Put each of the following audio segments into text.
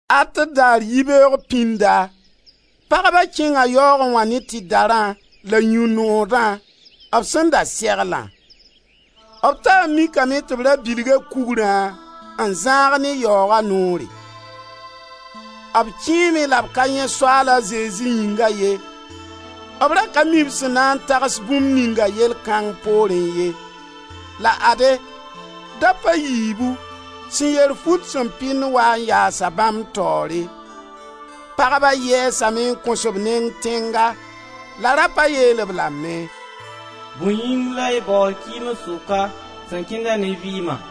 At daar yibeoog pĩnda, pagba kẽnga yaoogẽ wã ne tɩdarã la yũ-noodã b sẽn da seglã. B taa n mikame tɩ b ra bilga kugrã n zãag ne yaooga noore. B kẽeme la b ka yãe Soaala Zezi yĩnga ye. B ra ka mi b sẽn na n tags bũmb ninga yell kãng poorẽ ye. La ade, dap a yiibu sẽn yer fut sẽn pɩnd waa n yaasa bãmb taoore. Pagba yɛɛsame n kõs b neng tẽnga. La rapa yeel-b lame: «Bõe yĩng la y baood kɩɩms sʋka sẽn kẽnda ne vɩɩma?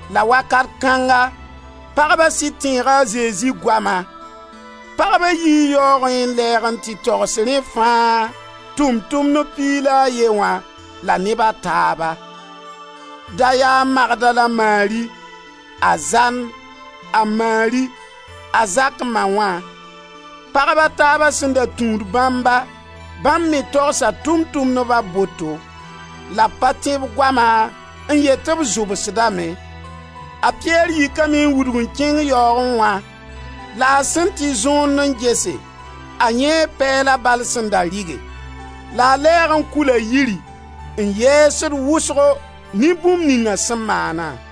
La Wakat kãnga pagba sɩd tẽega a Zezi goama. Pagba yii yaoogẽ n lɛɛg n tɩ togs rẽ fãa (Tʋʋm-tʋmdb) piig la a ye wã la neb a taaba. Da yaa Magdala Mari, a Zan, a Mari, a Zak ma wã. Pagb a taaba sẽn da tũud bãmba, bãmb me togsa Tʋʋm-tʋmdba boto. La b pa tẽ b goama n yet tɩ b zʋbsdame. A Pɩyɛr yikame n wudg n kẽng yaoogẽ wã la a sẽn tɩ zõond n gese, a yãee pɛɛla bal sẽn da rɩge. La a lɛɛg n kula yiri, n yɛɛsd wʋsgo ne bũmb ninga sẽn maana.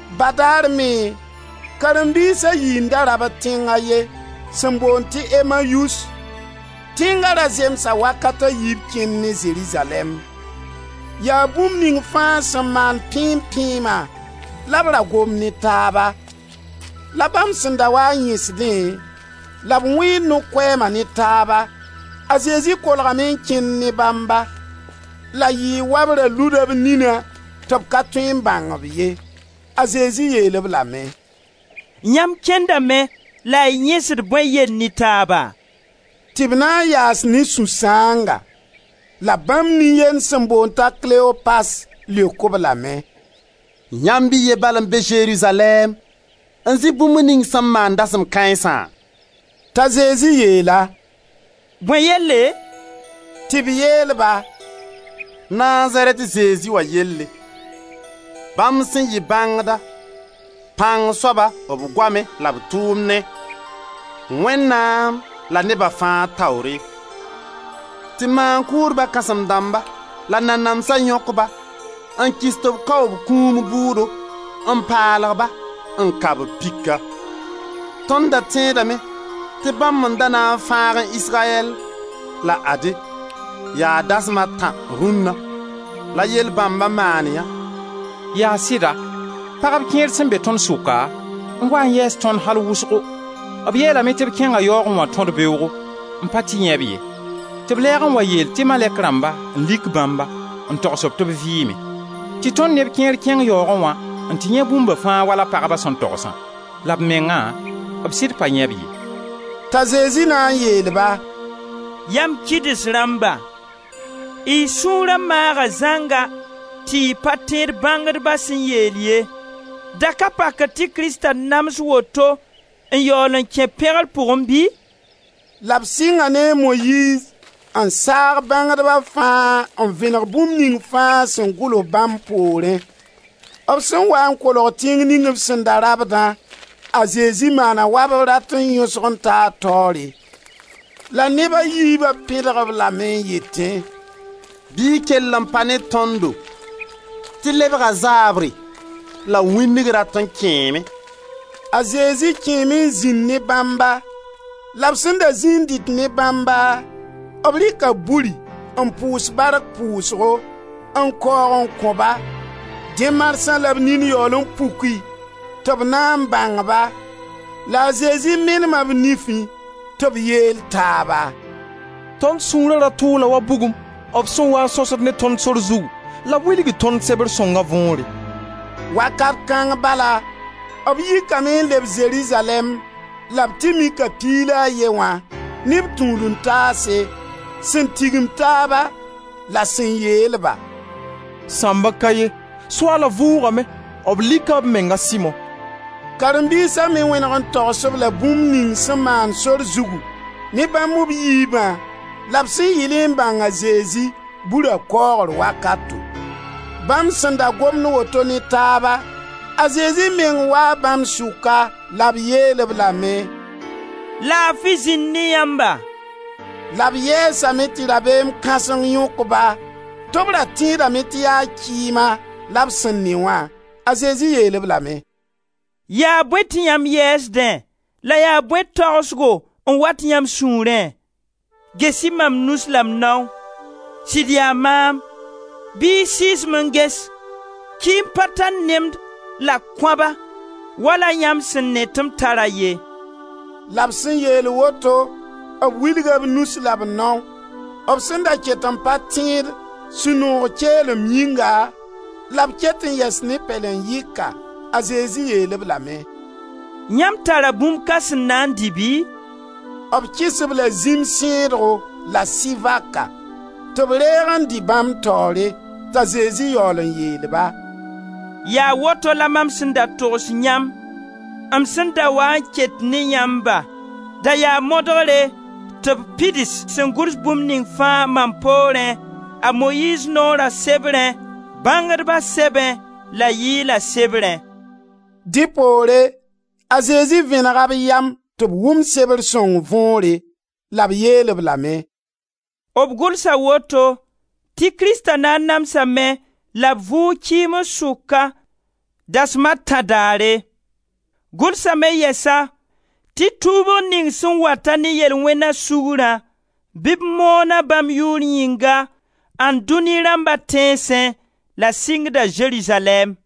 Badaare me, karen-biis a yi n da rabd tẽng a ye sẽn boond tɩ Emmayus; tẽnga ra zemsa wakata yiib kẽnd ne Zerizalɛɛm. Yaa bũmb ning fãa sẽn maam pẽem-pẽema la b ra gomd ne taaba. La bãmb sẽn da wa n yẽsdẽ la b wẽed no-koɛɛma ne taaba, a Zezi kolgame n kẽnd ne bãmba. La yɩɩ wa b ra luda b nina tɩ b ka tõe n bãng-b ye. A Zezi yeel-b lame: «Yãmb kẽndame la y yẽsd bõe yell ne taaba?» Tɩ b na n yaas ne sũ-sãanga. La bãmb nin-yend sẽn boond t'a Kleopas, leok-b lame: «Yãmb y ye bala n be Zerizalɛɛm n zɩ bũmb ning sẽn maan dasem kãensã?» T'a Zezi yeel-a: «Bõe yelle?» Tɩ b yeel-ba: «Nazarɛt Zezi wã yelle. Bãmb sẽn yɩ bãngda, pãng soaba b goamẽ la b tʋʋmnẽ, Wẽnnaam la neba fãa taoore. Tɩ maan-kʋʋdba kãsẽm dãmba la nanamsã yõk ba n kɩs tɩ b kao b kũum bʋʋdo n paalg-ba, n ka-b pika. Tõnd da tẽedame tɩ bãmb n da na n fãagẽ Israyɛl, la ade, yaa dasma a tã rũnna, la yell bãmba maan yã. Yaa sɩda, pagb kẽer sẽn be tõnd sʋka n waa n yɛɛs tõnd al wʋsgo; b yeelame tɩ b kẽnga yaoogẽ wã tõd-beoogo, n pa tɩ yãe-b ye, tɩ b lɛɛg n wa yeel tɩ malɛk rãmba m n lik bãmba, n togs tɩ b vɩɩme. Tɩ tõnd neb kẽer kẽng yaoogẽ wã n tɩ yãe bũmba fãa wala pagba sẽn togsã, la b mengã, b sɩd pa yãe-b ye.» T'a Zezi na n yeel-ba: «Yam kɩds rãmba, y sũura maaga zãnga tɩ y pa tẽed bãngdba sẽn yeel ye. Da ka pakr tɩ Krista nams woto n yaool n kẽ b pẽgr pʋgẽ bɩ?» La b sɩnga ne a Moyiiz n saag bãngdba fãa n vẽnegd bũmb ning fãa sẽn gʋls bãmb poorẽ. B sẽn waa n kolg tẽng ning b sẽn da rabdã, a Zezi maana wa b rat n yõsg n taa taoore. La neb a yiiba pẽdg-b lame n yetẽ: «Bɩ y kell n pa ne tõndo tɩ lebga zaabre la wĩndg rat n kẽeme!» A Zezi kẽeme n zĩnd ne bãmba. La b sẽn da zĩi n dɩt ne bãmba, b rɩka buri n pʋʋs bark pʋʋsgo, n kaoog n kõ-ba. Dẽ marsã la b nin yaool n puki tɩ b na n bãng ba; la a Zezi menema b nifẽ. Tɩ b yeel taaba: «Tõnd sũura ra tʋʋla wa bugum b sẽn waa n sõsd ne tõnd sor zugu la b wilgd tõnd sebr sõnga võore.» Wakat kãng bala b yikame n leb Zerizalɛɛm la b tɩ mika piig la a ye wã, ne b tũud-n-taase, sẽn tigim taaba, la sẽn yeel-ba: «Sãmbg ka ye, Soaala vʋʋgame; b lika b meng a Simo!» Karen-biisa me wẽneg n togs-b la bũmb ning sẽn maan sor zugu ne bãmb b yiibã la b sẽn yɩlẽ n bãng a Zezi, bura kaoogr wakato. Bãmb sẽn da gomd woto ne taaba, a Zezi meng waa bãmb sʋka la b yeel-b lame: «Laafi zĩnd ne yãmba!» La b yɛɛsame tɩ rabeem kãseng yõk-ba tɩ b ra tẽedame tɩ yaa kɩɩma la b sẽn ne wã. A Zezi yeel-b lame «Yaa bõe tɩ yãmb yɛɛsdẽ la yaa bõe tagsgo n wat yãmb sũurẽ? Ges-y mam nus la m nao. Sɩd yaa maam! Bɩ y sɩɩs-m n ges; kɩɩm pa tar nemd la koaba wala yãmb sẽn ne tɩ m tara ye.» La b sẽn yeel woto b wilga b nus la b nao. B sẽn da ket n pa tẽed, sũ-noog keelem yĩnga, la b ket n yɛs ne pɛlen-yɩka, a Zezi yeel-b lame: «Yãmb tara bũmb ka sẽn na n dɩ bɩ?» B kɩs b la zĩm sẽedgo la sɩ-vaka tɩ b reeg n dɩ bãmb taoore. T'a Zezi yaool n yeel-ba: «Yaa woto la mam sẽn da togs yãmb, m sẽn da waa n ket ne yãmba, da yaa modgre, tɩ b pids sẽn gʋls bũmb ning fãa mam poorẽ, a Moyiiz noora sebrẽ, bãngdba sɛbẽ la yɩɩla sebrẽ.» Dẽ poore a Zezi vẽnega b yam tɩ b wʋm sebr sõng võore. La b yeel-b lame: «B gʋlsa woto tɩ Krista na n namsame la b vʋʋg kɩɩms sʋka dasem a tã daare. Gʋlsame yɛsa tɩ tuubg ning sẽn wat-a ne yel-wẽna sugrã, bɩ b moon-a bãmb yʋʋr yĩnga ãndunĩ rãmba tẽnsẽ la sɩngda Zerizalɛɛm.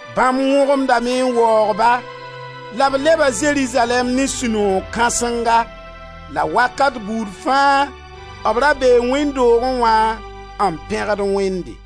Bãmb wõgemdame n waoog-ba la b leba Zerizalɛɛm ne sũ-noog kãsenga, la wakat buud fãa b ra bee wẽnd doogẽ wã n pẽgd Wẽnde.